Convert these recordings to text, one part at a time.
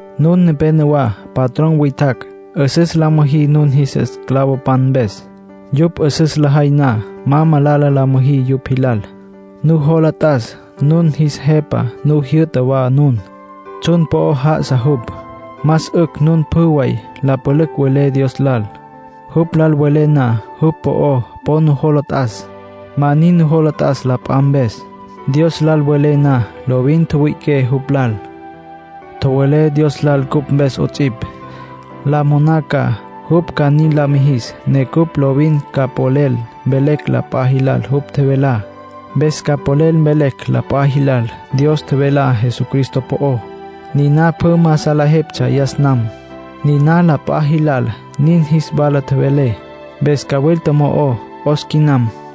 Nun nepénowa patrón witjacj. 'Üsüs la müjí nun jis esclavopan mpes. Yupj 'üsüs lajay na, ma malala la müjí yupj jilal. Nujola t'as, nun jis Jepa nu jyü'ta wa nun. Tsjun po'o já'asa jupj. Más 'ücj nun pjü way la pülücj welé Dios lal. Jupj lal welé na, jupj po'o po nujola t'as. Ma nin nujola t'as la p'a mpes. Dios lal welé na, lovin tjüwüi'iqué jupj lal. Tjowelé Dios lal cupj mpes 'ots'ipj. La moná ca jupj ca nin la mijis ne cupj lovin ca polel mvelecj la p'a jilal jupj tjevelá. Mpes ca polel mvelecj la p'a jilal Dios tjevelá Jesucristo po'ó. Niná pjü ma salejeptsja yas nam. Niná la p'a jilal nin jis wala tjevelé, mpes cawilta mo'o 'os quinam.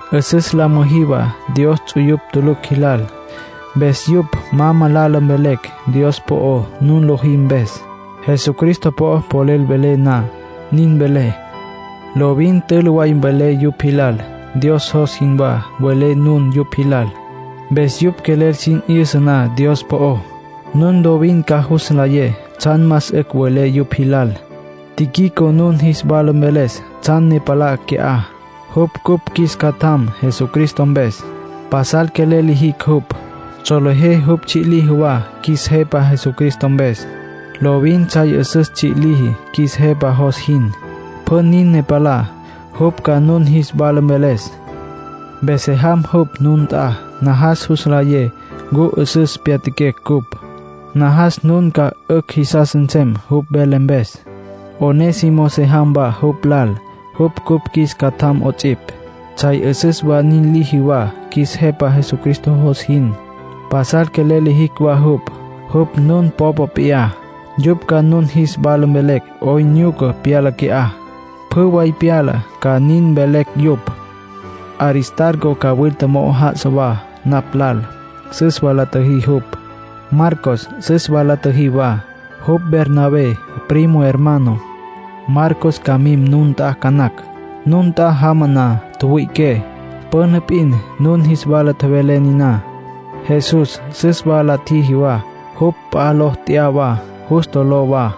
'Üsüs la müjí wa Dios ts'uyupj tulucj jilal. Mpes yupj ma malala mvelecj Dios po'ó nun lojí mpes. Jesucristo po'ó polel welé na, nin mvelé. Lovin tülü way mvelé yupj jilal. Dios jos jinwá mvelé nun yupj jilal. Mpes yupj quelel sin 'yüsa na Dios po'ó, nun lovin ca jus nlayé tsjan más 'ücj welé yupj jilal. Tíquico nun jis wala mveles tsjan ne palá qui'á. Jupj cupj qjuis catjam Jesucristo mpes. Pasal quelel lijicj jupj. Solejé jupj tsji' liji wa qjuis Jepa Jesucristo mpes. Lovin tsjay 'üsüs tsji' liji qjuis Jepa jos jin. Pjü nin ne palá, jupj ca nun jis wala mveles. Mpes se jam jupj nun nt'a. Najas jus nlayé ncu 'üsüs pyatjaquecj ncupj. Najas nun ca 'ücj jisas nsem jupj vele mpes. Onésimo se jam wa jupj lal. Jupj cupj qjuis catjam 'ots'ipj. Tsjay 'üsüs way nin liji wa qjuis Jepa Jesucristo jos jin. Pasal quelel lijicj wa jupj. Jupj nun popa p'iyá. Yupj ca nun jis wala mvelecj 'oyn nyuca pyala qui'á. Pjü way pyalá ca nin mvelecj yupj. Aristarco cawilta mo'o já'asa wa napj lal. Süs wa la tjiji jupj. Marcos süs wa la tjiji wa. Jupj Bernabé primo hermano. Marcos ca mim nun nt'a ca nacj. Nun nt'a jama na, tjüwüi'iqué. Püna p'in nun jis wala tjevelé niná. Jesús süs wa la tjiji wa. Jupj p'a ló tya'a wa; Justo ló wa.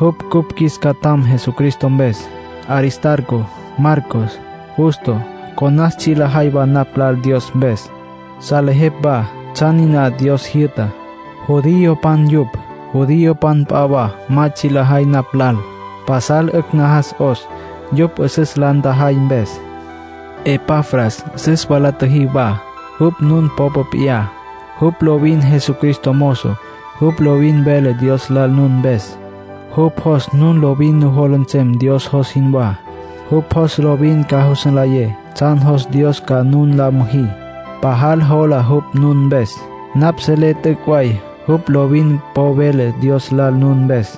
Jupj cupj qjuis catjam Jesucristo mpes. Aristarco, Marcos, Justo, conas tsji' lajay wa napj lal Dios mpes. Salejepj wa tsjan niná Dios jyü'tá. Judiopan yupj. Judiopan p'a wa ma tsji' lajay napj lal. Pasal 'ücj najas 'os, yupj 'üsüs la ntjajay mpes. Epafras süs wa la tjiji wa. Jupj nun popa p'iyá. Jupj lovin Jesucristo mozo. Jupj lovin vele Dios lal nun mpes. Jupj jos nun lovin nujola nsem Dios jos jinwá. Jupj jos lovin ca jus nlayé tsjan jos Dios ca nun la müjí. Pajal jola jupj nun mpes. Napj selé t'üc' way jupj lovin po vele Dios lal nun mpes,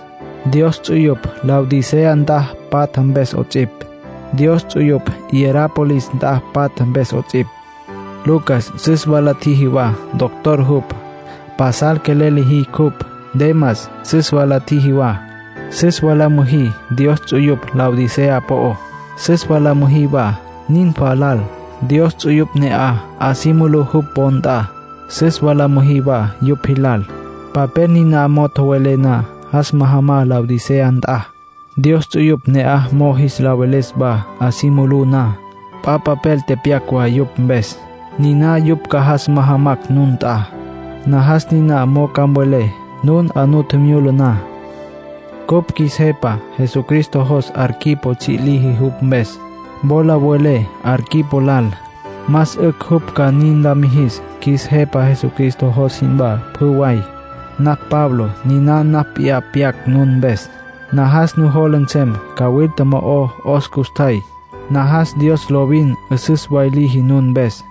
Dios ts'uyupj Laodicea nt'a patja mpes 'ots'ipj, Dios ts'uyupj Hierápolis nt'a patja mpes 'ots'ipj. Lucas süs wa la tjiji wa, doctor jupj. Pasal quelel lijicj jupj. Demas süs wa la tjiji wa. Süs wa la müjí Dios ts'uyupj Laodicea po'ó. Süs wa la müjí wa Ninfa lal. Dios ts'uyupj ne'aj 'a si mulú jupj wo nt'a. Süs wa la müjí wa yupj jilal. Papel niná mo'o tjowelé na, jas majamá Laodicea nt'a, Dios ts'uyupj ne'aj mo'o jis la veles wa 'a si mulú na. P'a papel tepyac wa yupj mpes. Niná yupj ca jas majamacj nun nt'a. Najas niná mo'o ca mvelé nun 'a nu tjimyula na. Cupj qjuis Jepa Jesucristo jos Arquipo tsji' liji jupj mpes. Wola mvelé Arquipo lal, más 'ücj jupj ca nin la mijis qjuis Jepa Jesucristo jos jinwá, pjü way. Napj Pablo. Niná napj p'iyá pyac nun mpes. Najas nujola nsem cawilta mo'o 'os custjay. Najas Dios lovin 'üsüs way liji nun mpes.